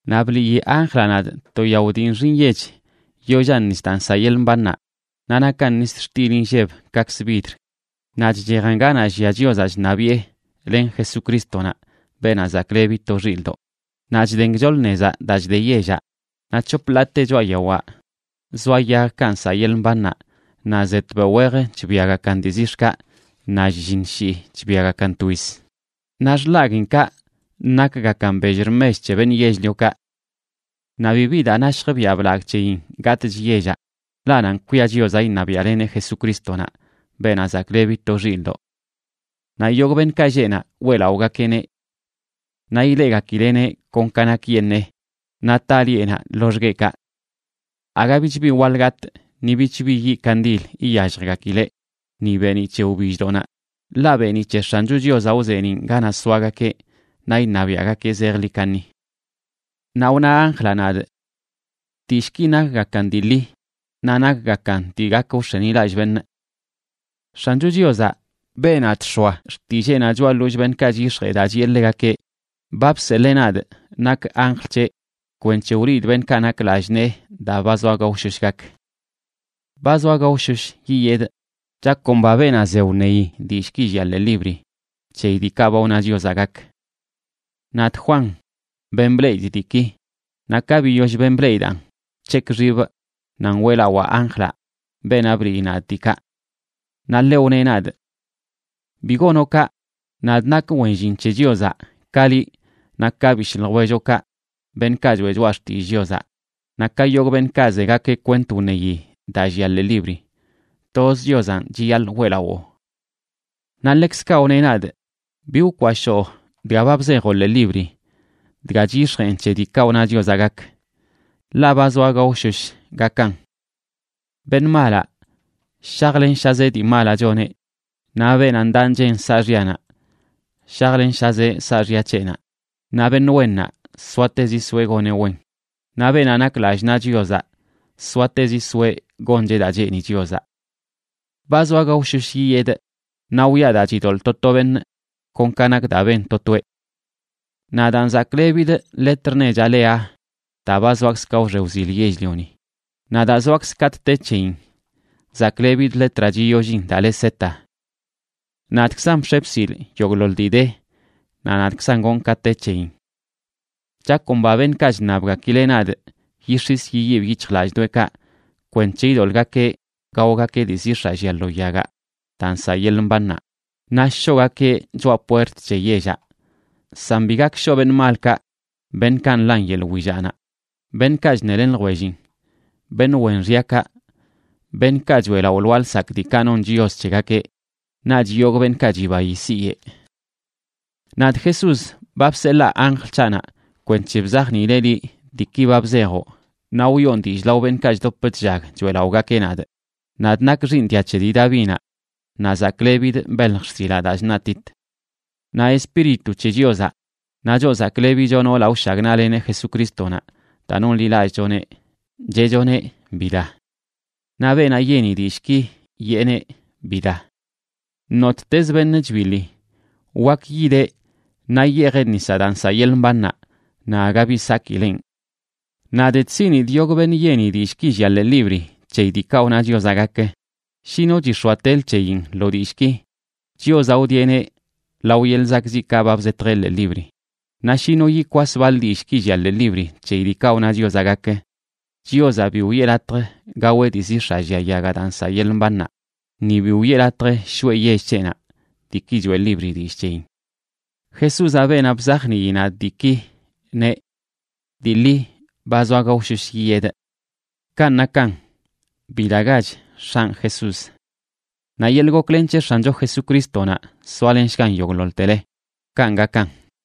Naꞌ bliꞌyi anjlaꞌ nadꞌ to yao dii nxi nyech yollan nis daa nsaꞌ yeḻꞌ mbannaꞌ, naꞌ nakan nis xtil inlleb kaꞌkzə vidr. Naꞌ chchejan ganaꞌ llia Chiozaꞌ chṉabiꞌe len Jesucrístonaꞌ, Beenaꞌ Zaklebi to Xilꞌdoꞌ, naꞌ chden gchoḻ nezaꞌ daa chde yellaꞌ. Naꞌ c̱hop ḻaate choꞌa yawaꞌ zoa yagkaꞌ nsaꞌ yeḻꞌ mbannaꞌ, naꞌ ze tbeoꞌ wej chbiagakan dii zix̱kaꞌ, naꞌ shlliṉ shii chbiagakan twiz. Naꞌ xḻaguiinkaꞌ nakgakan bell rmech c̱he beṉꞌ yell-liokaꞌ. Naꞌ bibi daa nashj biaꞌ blagꞌ c̱heyin gatꞌch yellaꞌ, ḻaꞌ nanꞌ kwia Chiozaꞌ iṉabiaꞌleneꞌ Jesucrístonaꞌ, Beenaꞌ Zaklebi to Xilꞌdoꞌ. Naꞌ yogꞌ beṉꞌkaꞌ lleꞌ naꞌ weꞌlaꞌogakeꞌneꞌ. Naꞌ ileꞌgakileꞌneꞌ kon ka nakyeṉee, naꞌ taꞌ lieꞌnaꞌ loxgueꞌkaꞌ. Aga bich bi waḻ gatꞌ, ni bich bi yiꞌ kandil iyalljgakileꞌ ni beeniꞌ c̱he wbilldoꞌnaꞌ, ḻaꞌ beeniꞌ c̱he X̱ancho Chiozaꞌ wzeeniꞌn ganaꞌ soagakeꞌ, naꞌ iṉabiaꞌgakeꞌ zejḻi kaṉi. Naꞌ wna anjlaꞌ nadꞌ: ―Dillꞌki nakgakan dii ḻi naꞌ nakgakan dii gak wx̱enilallꞌ beṉꞌ. X̱ancho Chiozaꞌ, beenaꞌ chx̱oa xtilleenaꞌ choꞌa ḻollꞌ beṉꞌkaꞌ chyix̱jee daa chiꞌe ḻegakeꞌ, ba bseḻee nadꞌ nakꞌ anjl c̱heꞌ kwenc̱he wliidꞌ beṉꞌkaꞌ nak lallꞌ nee daa ba zoa gaoshosh gak. ―¡Ba zoa gaoshosh yiyedꞌ! Chakomba beenaꞌ ze wṉeyi dillꞌki llia ḻee libri c̱heyi diikaꞌ ba wna Chiozaꞌ gak. Nadꞌ, Juan, ben bleꞌidꞌ diiki. Naꞌ ka biyoll ben bleꞌidaꞌn, bc̱hekꞌ xibꞌ nan weꞌlawaa anjlaꞌ, beenaꞌ bliꞌyi nadꞌ diikaꞌ. Naꞌ ḻeꞌ wneꞌ nadꞌ: ―¡Bi gonoꞌ kaꞌ! Nadꞌ nakꞌ wen llin c̱he Chiozaꞌ ka liꞌ naꞌ ka bishꞌ ljwelloꞌkaꞌ, beṉꞌkaꞌ choꞌe choꞌa xtillꞌ Chiozaꞌ, naꞌ ka yogꞌ beṉꞌkaꞌ zegakeꞌ kwent wṉeyi daa llia ḻee libri. Toz Chiozanꞌ chiyaḻꞌ weꞌlawoo. Naꞌ ḻekzkaꞌ wneꞌ nadꞌ: ―Bi wkwashoo dga ba bzejoꞌ ḻee libri, dga chyix̱jeꞌn c̱he diikaꞌ wna Chiozaꞌ gak, ḻaꞌ ba zoa gaoshosh gakan. Beṉꞌ malaꞌ shajlenshazeꞌ dii malaꞌ choneꞌ, naꞌ beenaꞌ ndaꞌ nchen saaxyanaꞌ shajlenshazeꞌ saaxya c̱heꞌnaꞌ; naꞌ beṉꞌ wennaꞌ soatezi soeꞌ goneꞌ wen, naꞌ beenaꞌ nak lallꞌ naꞌ Chiozaꞌ soatezi soeꞌ goncheꞌ daa cheeni Chiozaꞌ. ―¡Ba zoa gaoshosh yiyedꞌ! Naꞌ wiꞌa daa chidoḻꞌ to to beṉꞌ kon ka nak daa ben to toeꞌ. Nadaan zaklebidꞌ letr nechaꞌ le Aa daa ba zoakzꞌ ka wxe wzil yell-lioni, naꞌ daa zoakzꞌ katꞌ te c̱heyin zaklebidꞌ letraꞌ chiyollin daa le Z,b Nadꞌkzan bx̱e bsilꞌ yogꞌḻoḻ dii de naꞌ nadꞌkzan gonꞌ ka te c̱heyin. Chakomba beṉꞌkaꞌ chṉabgakileꞌ nadꞌ yix̱is yiyibꞌ yic̱hjlallꞌdoꞌekaꞌ, kwenc̱he idoḻꞌgakeꞌ gaogakeꞌ dii zix̱aꞌ llia lo yagaꞌ daa nsaꞌ yeḻꞌ mbannaꞌ, naꞌ shoꞌgakeꞌ choꞌa puert c̱he yellaꞌ. San bi gak shoꞌ beṉꞌ malkaꞌ, beṉꞌkaꞌ nḻan yeḻꞌ willaꞌnaꞌ, beṉꞌkaꞌ chṉelen ljwellin, beṉꞌ wen xyakaꞌ, beṉꞌkaꞌ choeꞌlaꞌo lwaa lsakꞌ diikaꞌ non chios c̱hegakeꞌ, naꞌch yogꞌ beṉꞌkaꞌ chibayi siyeꞌ. Nadꞌ, Jesús, ba bseḻaa anjl c̱haꞌnaꞌ kwenc̱he bzajniileꞌ liꞌ diiki ba bzejoꞌ naꞌ wiꞌon dillꞌ lao beṉꞌkaꞌ chdop chllag choeꞌlaꞌogakeꞌ nadꞌ. Nadꞌ nakꞌ xiiṉ dia c̱he dii Davinaꞌ, naꞌ zaklebidꞌ belj xsilaꞌ daa chṉaꞌtit. Naꞌ Espíritu c̱he Chiozaꞌ, naꞌ choꞌ zaklebicho noolaꞌ wshagnaꞌleneꞌ Jesucrístonaꞌ daa nonḻilallꞌchoneꞌ, cheꞌchoneꞌ: ―¡Bida! Naꞌ beenaꞌ yeni dillꞌki yeeneꞌ: ―¡Bida! Nottezꞌ beṉꞌ chbiḻi, wak yideꞌ naꞌ yeejeꞌ nisaꞌ daa nsaꞌ yeḻꞌ mbannaꞌ, naꞌ aga bi sakileꞌn. Nadꞌ chsiꞌnidꞌ yogꞌ beṉꞌ yeni dillꞌki llia ḻee libri c̱heyi diikaꞌ wna Chiozaꞌ gak: Shi no chix̱oatelə c̱heyin lo dillꞌki, Chiozaꞌ wdieꞌneꞌ lao yeḻꞌ zakꞌziꞌkaꞌ ba bzetjeꞌ ḻee libri. Naꞌ shi no yikwas baḻ dillꞌki llia ḻee libri c̱heyi diikaꞌ wna Chiozaꞌ gak, Chiozaꞌ bi wiꞌe latj gaweꞌ dii zix̱aꞌ llia yagaꞌ daa nsaꞌ yeḻꞌ mbannaꞌ, ni bi wiꞌe latj shoꞌe yell c̱heꞌnaꞌ, diiki choeꞌ libri dillꞌ c̱heyin. Jesúzaꞌ, beenaꞌ bzajnii nadꞌ diiki, neꞌ: ―Dii ḻi, ba zoa gaoshosh yiyedꞌ. Kanꞌ nakan. ¡Bidagach, X̱anꞌ Jesús! Naꞌ yeḻꞌ goklen c̱he X̱ancho Jesucrístonaꞌ soalenshgan yogꞌḻoḻtele. Kanꞌ gakan.